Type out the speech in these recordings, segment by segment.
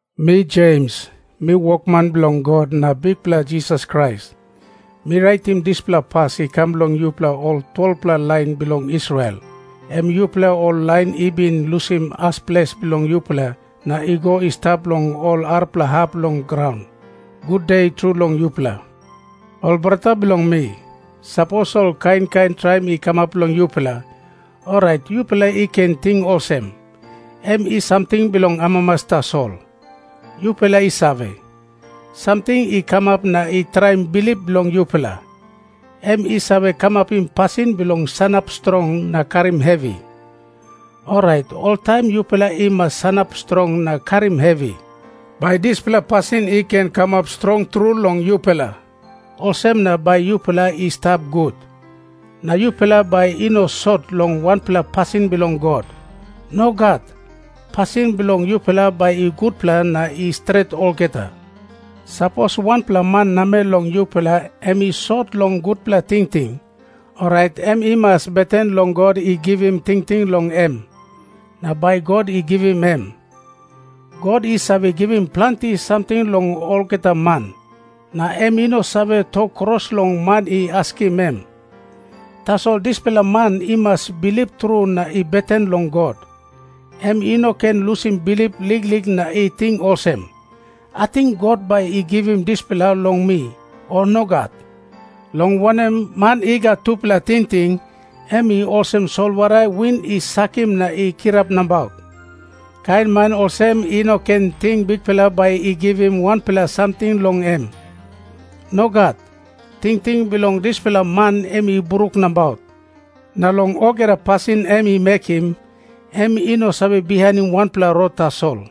Mi Jems, mi wokman bilong God na Bikpela Jisas Krais. Mi raitim dispela pas i kam long yupela ol 12-pela lain bilong Israel, em yupela ol lain i bin lusim as ples bilong yupela na i go i stap long ol arapela hap bilong graun. Gude tru long yupela. Ol brata bilong mi, sapos ol kain kain traim i kamap long yupela, orait yupela i ken ting olsem, em i samting bilong amamas tasol. Yupela i save, samting i kamap na i traim bilip bilong yupela, em i save kamapim pasin bilong sanap strong na karim hevi. Orait oltaim yupela i mas sanap strong na karim hevi, bai dispela pasin i ken kamap strong tru long yupela. Olsem na bai yupela i stap gut, na yupela bai i no sot long wanpela pasin bilong God. Nogat. Pasin bilong yupela bai i gutpela na i stret olgeta. Sapos wanpela man namel long yupela em i sot long gutpela tingting, orait em i mas beten long God i givim tingting long em, na bai God i givim em. God i save givim planti samting long olgeta man, na em i no save tok kros long man i askim em. Tasol dispela man i mas bilip tru na i beten long God. Em i no ken lusim bilip liklik na i ting olsem, "Ating God bai i givim dispela long mi, o nogat?" Long wanem, man i gat tupela tingting, em i olsem solwara win i sakim na i kirap nabaut. Kain man olsem i no ken ting Bikpela bai i givim wanpela samting long em. Nogat. Tingting bilong dispela man em i bruk nabaut, na long olgeta pasin em i mekim, em i no save bihainim wanpela rot tasol.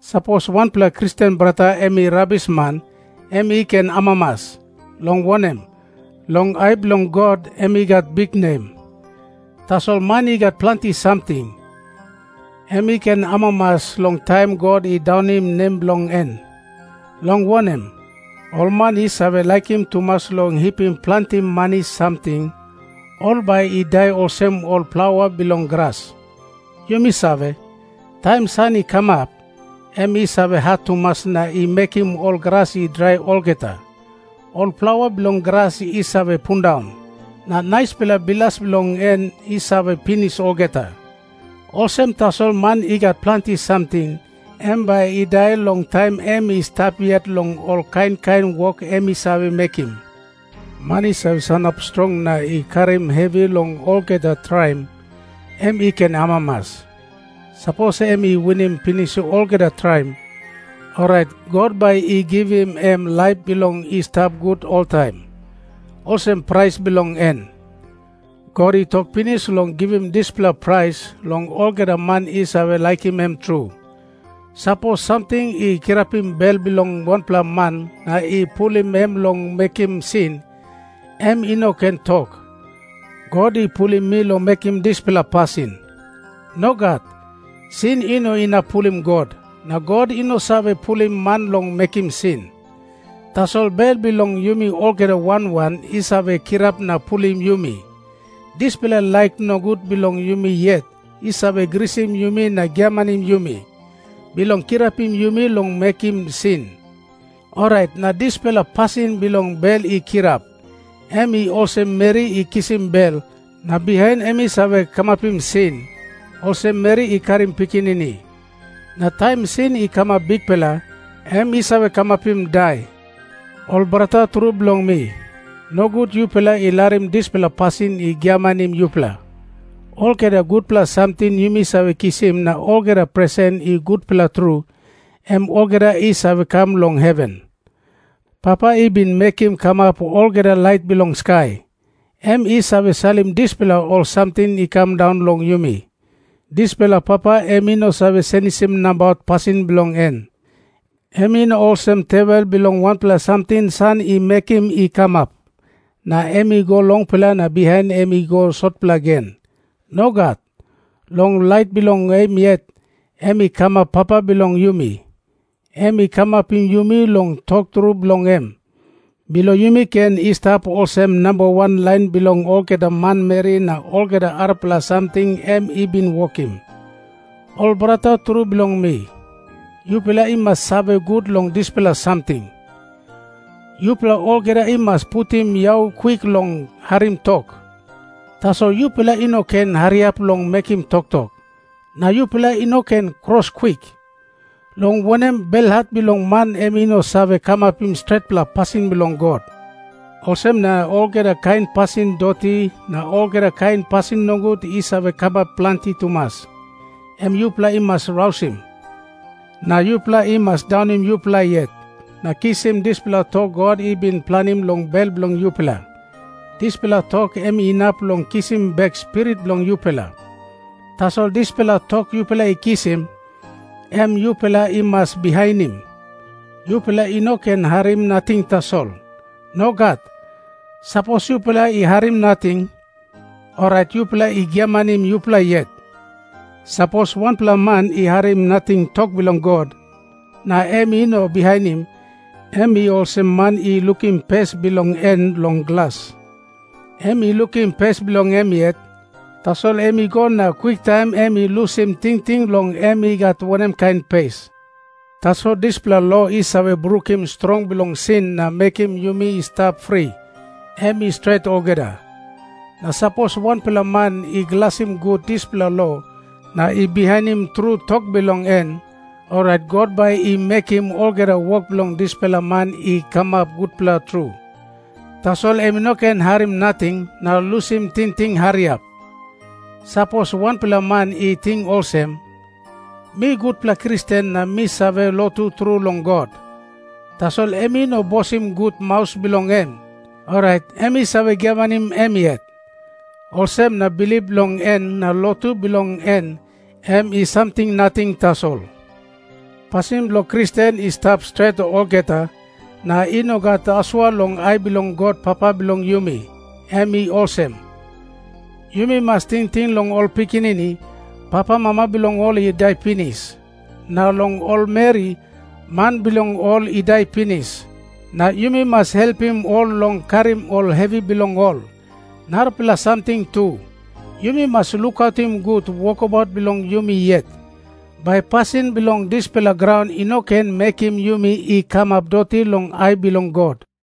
Sapos wanpela Kristen brata em i rabisman, em i ken amamas, long wanem, long ai bilong God em i gat biknem. Tasol man i gat planti samting, em i ken amamas long taim God i daunim nem bilong en. Long wanem, ol man i save laikim tumas long hipim planti mani samting, ol bai i dai olsem ol plaua bilong gras. Yumi save, taim san i kamap, em i save hat tumas na i mekim ol gras i drai olgeta. Ol plaua bilong gras i save pundaun, na naispela bilas bilong en i save pinis olgeta. Olsem tasol man i gat planti samting em bai i dai long taim em i stap yet long ol kain kain wok em i save mekim. Man i save sanap strong na i karim hevi long olgeta traim, em i ken amamas. Sapos em i winim pinis olgeta traim, orait God bai i givim em laip bilong i stap gut oltaim, olsem prais bilong en. God i tok pinis long givim dispela prais long olgeta man i save laikim em tru. Sapos samting i kirapim bel bilong wanpela man na i pulim em long mekim sin, em i no ken tok, "God i pulim mi long mekim dispela pasin." Nogat. Sin i no inap pulim God, na God i no save pulim man long mekim sin. Tasol bel bilong yumi olgeta wan wan i save kirap na pulim yumi. Dispela laik nogut bilong yumi yet i save grisim yumi na giamanim yumi, bilong kirapim yumi long mekim sin. Orait na dispela pasin bilong bel i kirap, em i olsem meri i kisim bel, na bihain em i save kamapim sin, olsem meri i karim pikinini. Na taim sin i kamap bikpela, em i save kamapim dai. Ol brata tru bilong mi, nogut yupela i larim dispela pasin i giamanim yupela. Olgeta gutpela samting yumi save kisim na olgeta presen i gutpela tru, em olgeta i save kam long heven. Papa i bin mekim kamap olgeta lait bilong skai, em i save salim dispela ol samting i kam daun long yumi. Dispela Papa em i no save senisim nabaut pasin bilong en. Em i no olsem tewel bilong wanpela samting san i mekim i kamap, na em i go longpela na bihain em i go sotpela gen. Nogat. Long laik bilong em yet, em i kamap Papa bilong yumi. Em i kamapim yumi long tok tru bilong em, bilong yumi ken i stap olsem namba wan lain bilong olgeta manmeri na olgeta arapela samting em i bin wokim. Ol brata tru bilong mi, yupela i mas save gut long dispela samting. Yupela olgeta i mas putim yau kwik long harim tok, tasol yupela i no ken hariap long mekim toktok, na yupela i no ken kros kwik. Long wanem, belhat bilong man em i no save kamapim stretpela pasin bilong God. Olsem na olgeta kain pasin doti na olgeta kain pasin nogut i save kamap planti tumas, em yupela i mas rausim. Na yupela i mas daunim yupela yet na kisim dispela tok God i bin planim long bel bilong yupela. Dispela tok em inap long kisim bek spirit bilong yupela. Tasol dispela tok yupela i kisim, em yupela i mas bihainim. Yupela i no ken harim nating tasol. Nogat. Sapos yupela i harim nating, orait yupela i giamanim yupela yet. Sapos wanpela man i harim nating tok bilong God, na em i no bihainim, em i olsem man i lukim pes bilong en long glas. Em i lukim pes bilong em yet, tasol em i go na kwiktaim em i lusim tingting long em i gat wanem kain pes. Tasol dispela lo i save brukim strong bilong sin na mekim yumi i stap fri, em i stret olgeta. Na sapos wanpela man i glasim gut dispela lo na i bihainim tru tok bilong en, orait God bai i mekim olgeta wok bilong dispela man i kamap gutpela tru. Tasol em i no ken harim nating na lusim tingting hariap. Sapos wanpela man i ting olsem, "Mi gutpela Kristen na mi save lotu tru long God," tasol em i no bosim gut maus bilong en, orait em i save giamanim em yet. Olsem na bilip bilong en na lotu bilong en em i samting nating tasol. Pasin bilong Kristen i stap stret olgeta na i no gat asua long ai bilong God Papa bilong yumi, em i olsem. Yumi mas tingting long ol pikinini, papamama bilong ol i dai pinis, na long ol meri, man bilong ol i dai pinis, na yumi mas helpim ol long karim ol hevi bilong ol. Narapela samting tu, yumi mas lukautim gut wokabaut bilong yumi yet, bai pasin bilong dispela graun i no ken mekim yumi i kamap doti long ai bilong God.